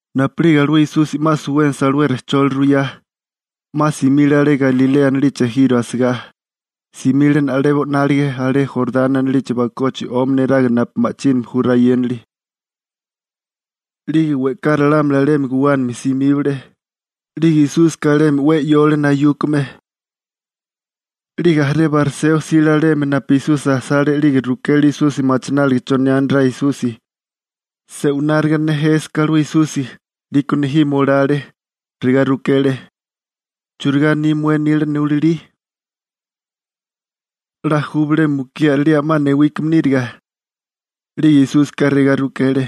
Napu'lige alué Esusi 'ma suwénasa alué rejcholi ruyá, 'ma simile alé Galilea anilichi ejiro asigá, simile na'lebo 'nálige alé Jorani anilichi bakochi 'omi neraga napu ma'chíname ju rayénali. 'Lige we'ká ralámuli alemi guwánami simíbale, 'lige Esúsika alemi 'we 'yole nayúkame. 'Lige jaré bariseo jsile alemi napu Esusi asale 'lige rukele Esusi machináliga chonirá Esusi, se'wináriga nejésaká alué Esusi, 'liko nejimo lale. Regá rukele: ―¿Churigá aní ramué nila nulalí? ¿'La ju bilé mukí a'rilía 'ma newíkame níriga? 'Lige Esúsika regá rukele: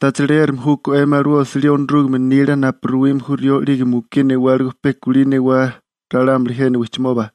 ―¿Tacha leérame júkó 'emi alué osilí Onorúgame nila napu ruwime ju rió 'lige mukí newáligo pe kulí newá ralámuli jena wijchimoba?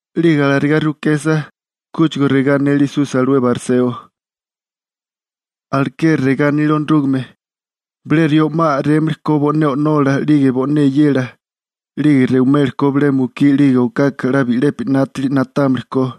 'Lige alarigá rukesa, kúchigo regá anele Esusi alué bariseo: ―Alekeri regá anile Onorúgame, bilé rió 'ma a'rémili ko bo'né o'nola 'lige bo'né eyela, 'lige rewimeli ko bilé mukí 'lige okaka 'la bi'lepi 'nátili na'támili ko.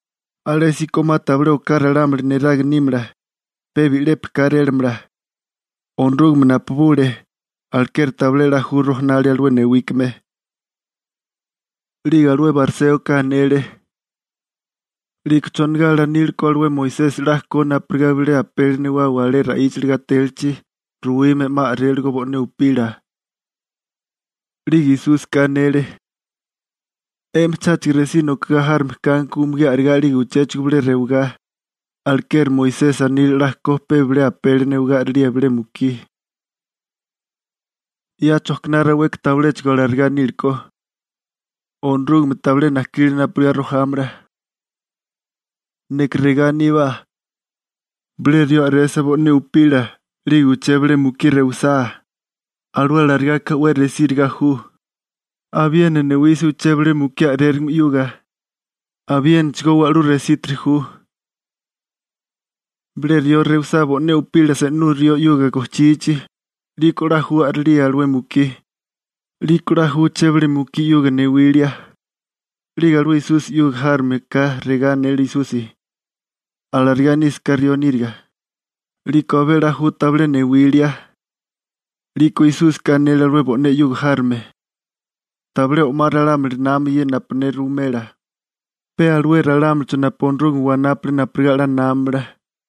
Alésíko 'ma tabilé oká ralámuli neraga nímala, pe bi'lepi kárélamala. Onorúgame napubule, alekeri tabilé 'la ju rojanalia alué newíkame. 'Lige alué bariséoka anele: ―¿'Liko chonigá 'la anile ko alué Moisesi 'la ko napurigá bilé apeli newawa alé ra'íchali gatélichi ruwime 'ma a'réligo bo'né upila? 'Lige Esúsika anele: ―'Emi cháchigo resí nokagá járome kanko umugí a'regá 'lige uchéchigo bilé rewigá, alekeri Moisesi anile 'la ko pe bilé apeli newagá a'rilía bilé mukí. 'Ya chojkiná raweka tabiléchigo alarigá nílekó. Onorúgameka tabilé najkile napurigá rojámala. Neka regá aníbá: Bilé rió a'resa bo'né upila 'lige uché bilé mukí rewisá, alué alarigaka 'we resíriga ju. Abiena newisa uché bilé mukí a'rérigame 'yuga, abiénachigó wa'lú resítiri ju. Bilé rió rewisá bo'né upila se'nú rió 'yuga gojchichi, 'liko 'la ju a'rilía alué mukí, 'liko 'la ju uché bilé mukí 'yuga newilia. 'Lige alué Esusi 'yuga járome ka regá anele Esusi: ―Alarigá nísaká rió níriga, 'liko abé 'la ju tabilé newilia. 'Liko Esúsika anele alué bo'né 'yuga járome: ―Tabilé o'má ralámuli nama ye napu ne ruwimela, pe alué ralámulicho napu Onorúgame wanápule napurigá 'la námamala.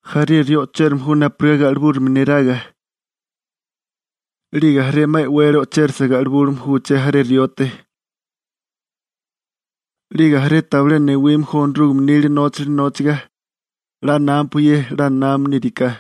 Jaré rió o'chérame ju napurigá ga'libúrigame neraga. 'Lige jaré 'ma e'wele o'chérisa ga'libume ju uché jaré riote. 'Lige jaré tabilé newime ju Onorúgame nila nóchali nóchiga. 'La námapua ye 'la námame níriká.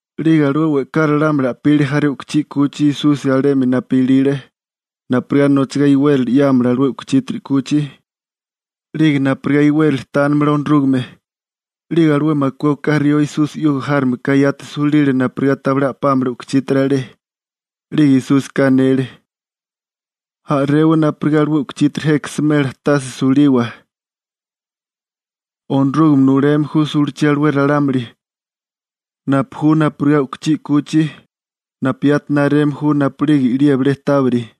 'Lige alué we'ká ralámuli a'pile jaré u'kuchí 'kuchi Esusi alemi napu ilile, napurigá nochagá iwérali 'yámala alué u'kuchítiri 'kuchi, 'lige napurigá iwérali tánimala Onorúgame, 'lige alué makué oká rió Esusi 'yuga járomeka yati sulile napurigá tabilé a'pámala u'kuchítiri alé. 'Lige Esúsika anele: ―A'rewa napurigá alué u'kuchítiri jeka smela tase suliwa. Onorúgame nuleme ju sulachí alué ralámuli napu ju napurigá u'kuchí 'kuchi napu yati nareme ju napu'lige i'lía bilé tábiri.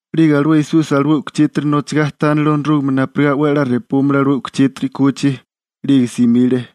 'Lige alué Esusi alué u'kuchítiri nochagá tánale Onorúgame napurigá 'we a'lá repúmala alué u'kuchítiri 'kuchi, 'lige simile.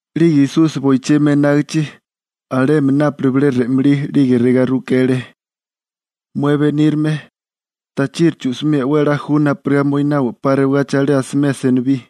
'Lige Esusi boichimi enágichi, alemi nápale bilé re'malí 'lige regá rukele: ―Mué benírame, ¿tachiri chu'simía 'we a'lá ju napurigá moinawa 'pa rewagachi alé asimea senibí?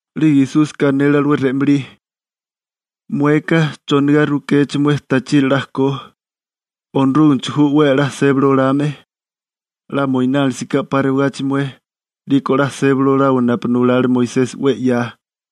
'Lige Esúsika anele alué re'malí: ―Mueka, ¿chonigá rukéché mué tachiri 'la ko? Onorúgamecho ju 'we a'lá sébali olame. 'La moinánilisaká 'pa rewagachi mué, 'liko 'la sébali olawa napu nulale Moisesi 'we 'ya.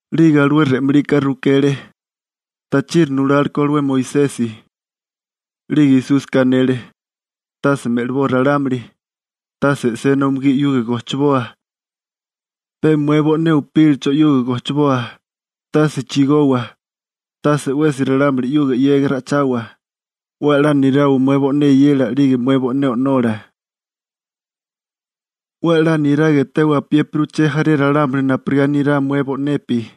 'Lige alué re'malika rukele: ―¿Tachiri nulálekó alué Moisesi? 'Lige Esúsika anele: ―Tase me'liboa ralámuli. Tase e'sena umugí 'yuga gojchiboa, pe mué bo'né upílacho 'yuga gojchiboa. Tase chigowa. Tase 'wesi ralámuli 'yuga 'yega ra'ichawa. 'We a'lá nirawa mué bo'né eyela 'lige mué bo'né o'nola. 'We a'lá niraga etewa apiépiri uché jaré ralámuli napurigá nirá mué bo'nepi.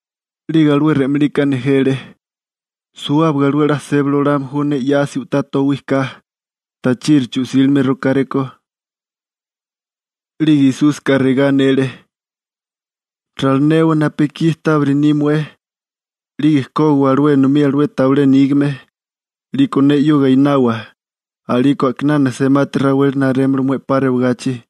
'Lige alué re'malika nejele: ―Suwábaga alué 'la sébali olame ju ne 'yasi u'tá towí ka. ¿Tachiri chu'sílime rokáréko? 'Lige Esúsika regá anele: ―Ralinewa napu ekí tábiri ni mué, 'lige kógiwa alué enomí alué tabilé nígame, 'liko ne 'yuga einawa, a'liko a'kinana semati raweli narémala mué 'pa rewagachi.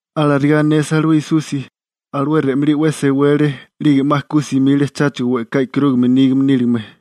Alarigá anesa alué Esusi, alué re'malí 'we sewele, 'lige 'ma ku simile cháchigo we'ká i'karúgame nígame níligame.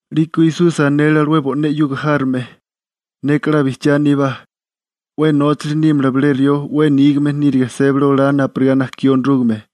'Liko Esusi anele alué bo'né 'yuga járome: ―Neka 'la bijchiá aníbá, 'we nóchali nímala bilé rió 'we nígame níriga sébali olá napurigá najkí Onorúgame.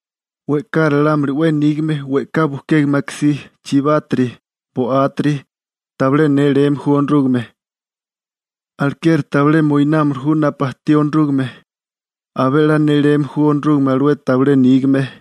We'ká ralámuli 'we nígame, we'ká bujkégame akasí, chibátiri, bo'átiri, tabilé néléme ju Onorúgame, alekeri tabilé moinámili ju napu ajtí Onorúgame. Abé 'la néléme ju Onorúgame alué tabilé nígame.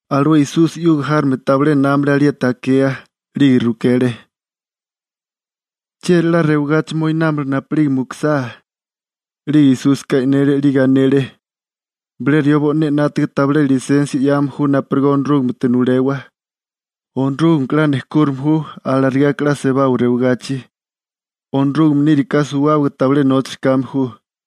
Alué Esusi 'yuga járome tabilé námale alieti akea, 'lige rukele: ―¿Chieri 'la rewagachi moinámala napu'lige mukusá? 'Lige Esúsika e'nénele 'lige anele: ―Bilé rió bo'né 'nátaga tabilé lisensia 'yame ju napurigá Onorúgamete nulewa, Onorúgameka 'la nejkúrime ju, alarigaka 'la sebawa rewagachi. Onorúgame níriká suwábaga tabilé nóchali kame ju.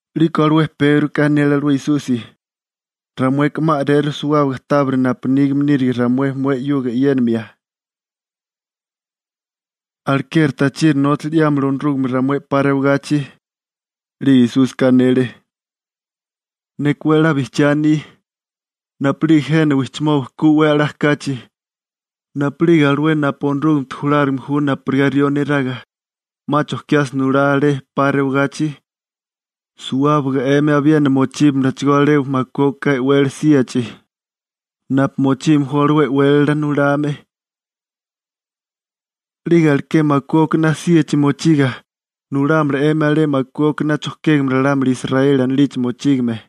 'Liko alué Pégroka anele alué Esusi: ―Ramueka 'ma a'reru suwábaga tábiri napu nígame nírige ramué mué 'yuga e'yénimia. Alekeri tachiri nóchali 'yámala Onorúgame ramué 'pa rewagachi. 'Lige Esúsika anele: ―Neka 'we a'lá bijchiá aní, napu'lige jena wijchimoba ku 'we a'lá kachi, napu'lige alué napu Onorúgamete julárigame ju napurigá rió neraga 'ma chojkiasa nulá alé 'pa rewagachi, suwábaga 'emi abiena mochíbamalachigó alé makué oká e'wele síachi napu mochime ju alué e'wélala nulame. 'Lige alaké makué okaná síachi mochiga, nulámala 'emi alué makué okaná chojkégame ralámuli Israeli anilichi mochígame.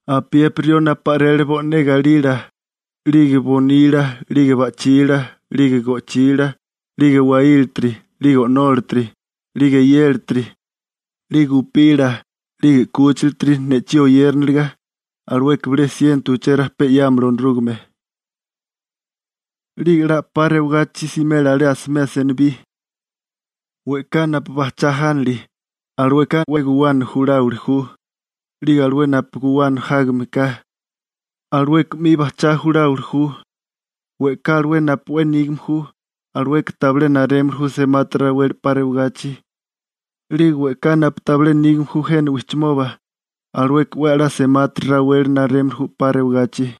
Apiépiri rió napu a'rele bo'né galila, 'lige bonila, 'lige ba'chila, 'lige go'chila, 'lige waílatiri, 'lige o'nólatiri, 'lige eyélatiri, 'lige upila, 'lige 'kúchilatiri, ne'chí oyériniliga, alueka bilé siento uché rajpé 'yámala Onorúgame. 'Lige 'la 'pa rewagachi simela alé asimea senibí. We'ká napu bajchá jánili, alueka pe guwana juláwili ju. 'Lige alué 'we guwana jágame ka, alueka 'mi bajchá juláwili ju. We'ká alué napu 'we nígame ju, alueka tabilé narémili ju semati raweli 'pa rewagachi, 'lige we'ká napu tabilé nígame ju jena wijchimoba, alueka 'we a'lá semati raweli narémili ju 'pa rewagachi.